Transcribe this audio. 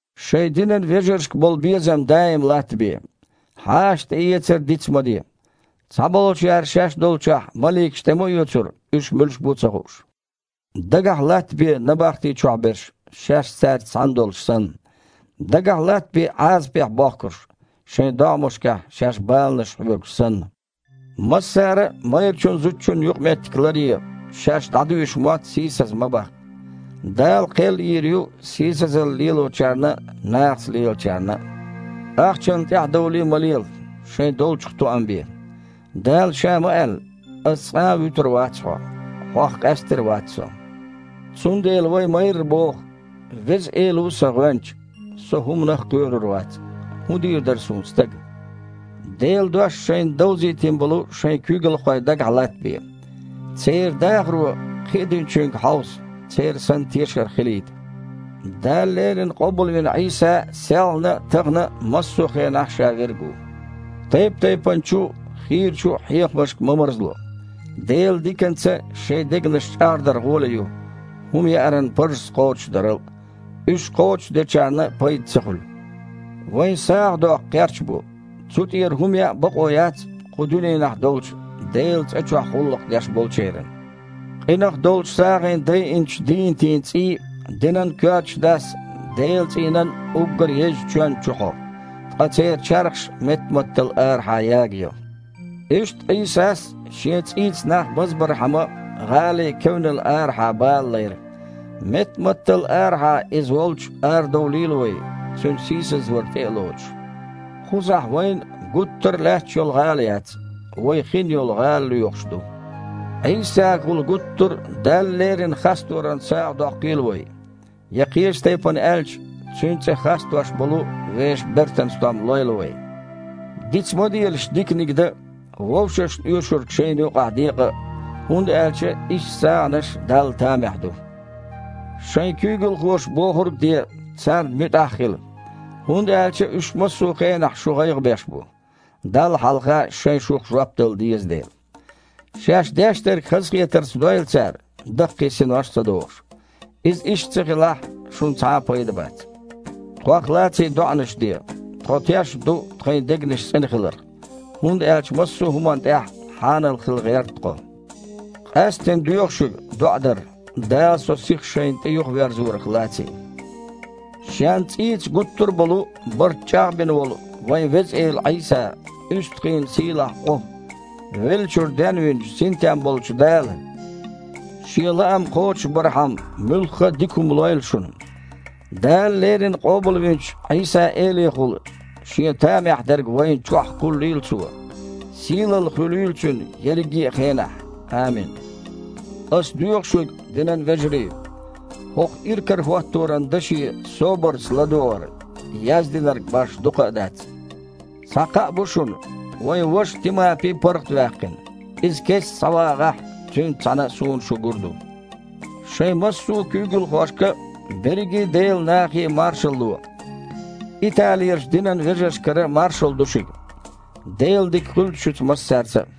Шайн динан вежаршка болу безам даим латтабе. Хьаша тІеэцар а диц ма де, цхьаболчара шаьш долчохь маликаш тІе ма оьцура, уьш муьлш бу а ца хууш. Дагахь латтабе набахти чохь берш, шаьш цаьрца цхьаьна долуш санна. Дагахь латтабе Іазапехь бохкурш, шайн догІмашкахь шаьш баланаш хьоьгуш санна. Массара а майрачун-зудчун юкъаметтиг ларъе, шаьш дІадуьйшу мотт сийсаз ма баккха. Дала кхел йийр ю сийсазалла лелочарна а, нахаца лелачарна а. Ахчанна тІаьхьадовлий ма лела, шайн долчух тоам бе. Дала Ша ма-аьлла: «Ас цкъа а вуьтур вац хьо, хьох къаьстар а вац Со». Цундела вай майрра боху: «Веза Эла ву сан гІоьнча, со хІуманах а кхоьрур вац. ХІун дийр дара суна стага?» Делан дош шайна довзийтина болу шайн куьйгалхой дагахь латтабе. Церан дахаро кхиадиначуьнга хьовса, церан санна тешар хилийта. Дала леррина къобалвина Іийса селхана а, тахана а, массо а хенахь а Ша Верг ву. Тайп-тайпанчу а, хийрачу а хьехамашка ма марзло. Делан диканца шайн дегнаш чІагІдар гІоле ю, хІума яаран парзаш кхочушдарал. Уьш кхочушдечарна пайда ца хуьлу. Вайн сагІа доккху кхерч бу, цу тІера хІума яа бакъо яц кху дуьненахь долчу Делан цІа чохь гІуллакх деш болчеран. Къинах долчу сагІина дайинчу дийнатийн цІий динан коьртачу дас Делан цІийнан уггар езачу чоьнна чу хьо, ткъа церан чархаш меттаматтал арахьа ягайо. Иштта Іийсас а, Шен цІийца нах базбархьама, гІалин кевнал арахьа бала лайра. Меттаматтал арахьа Иза волчу арадовлийла вай, Цуьнан сийсазвар тІе а лоцуш. Кхузахь вайн гуттар а лаьтташ йолу гІала яц, вай хин йолу гІала лоьхуш ду. Іийсагахула гуттар а Далла лерина хасторан сагІа доккхийла вай, я, кхечу тайпана аьлча, Цуьнан цІе хастош болу вешан бертан стом лойла вай. Диц ма делаш диканиг дан а, вовшашна оьшург шайна юкъахь декъа а, хІунда аьлча иштта сагІанаш Далла тамехь ду. Шайн куьйгалхоша бохург а де, царна муьтІахь а хила, хІунда аьлча уьш массо а хенахь шун гІайгІа беш бу, Далла хьалха шайн шух жоп дала деза дела. Шаьш деш дерг хазахетарца дойла цара, даккхий синош а ца дохуш. Иза иштта ца хилахь, шуна цхьа а пайда бац. Тхох лаций доІанаш де. Тхо тешна ду тхайн дегнаш цІена хиларх, хІунда аьлча массо а хІуманна тІехь хьанал хила гІерта тхо. Къаьсттина доьху шуьга доІа дар, Дала со сиха шайна тІе юхаверзорах лаций. Шен цІийца гуттар а болу барт чІагІбина волу вайн Веза Эла Іийса, уьстагІийн сийлахь Іу, веллачуьра денвинчу, синтем болчу Дала, Шен лаам кхочушбархьама, муьлхха а дика хІума лойла шуна. Дала леррина къобалвинчу Іийса-Элехула Шен тамехь дерг вайна чохь кхуллийла Цо. Сийлалла хуьлийла Цуьнан ерриге а хенахь. Амин. Ас доьху шуьга, динан вежарий, хІокху иракарахІотторан даше собарца ладогІар, яздинарг башха дукха а дац. Цхьа кхаъ бу шуна: вайн ваша Тимапи паргІатваьккхина. Иза кестта схьавагІахь, цуьнца цхьаьна суна шу гур ду. Шайн массо а куьйгалхошка а, берриге Делан нахе а маршалла ло. Италерчу динан вежаршкара маршалла ду шуьга. Делан дика хуьлда шуьца массаьрца а.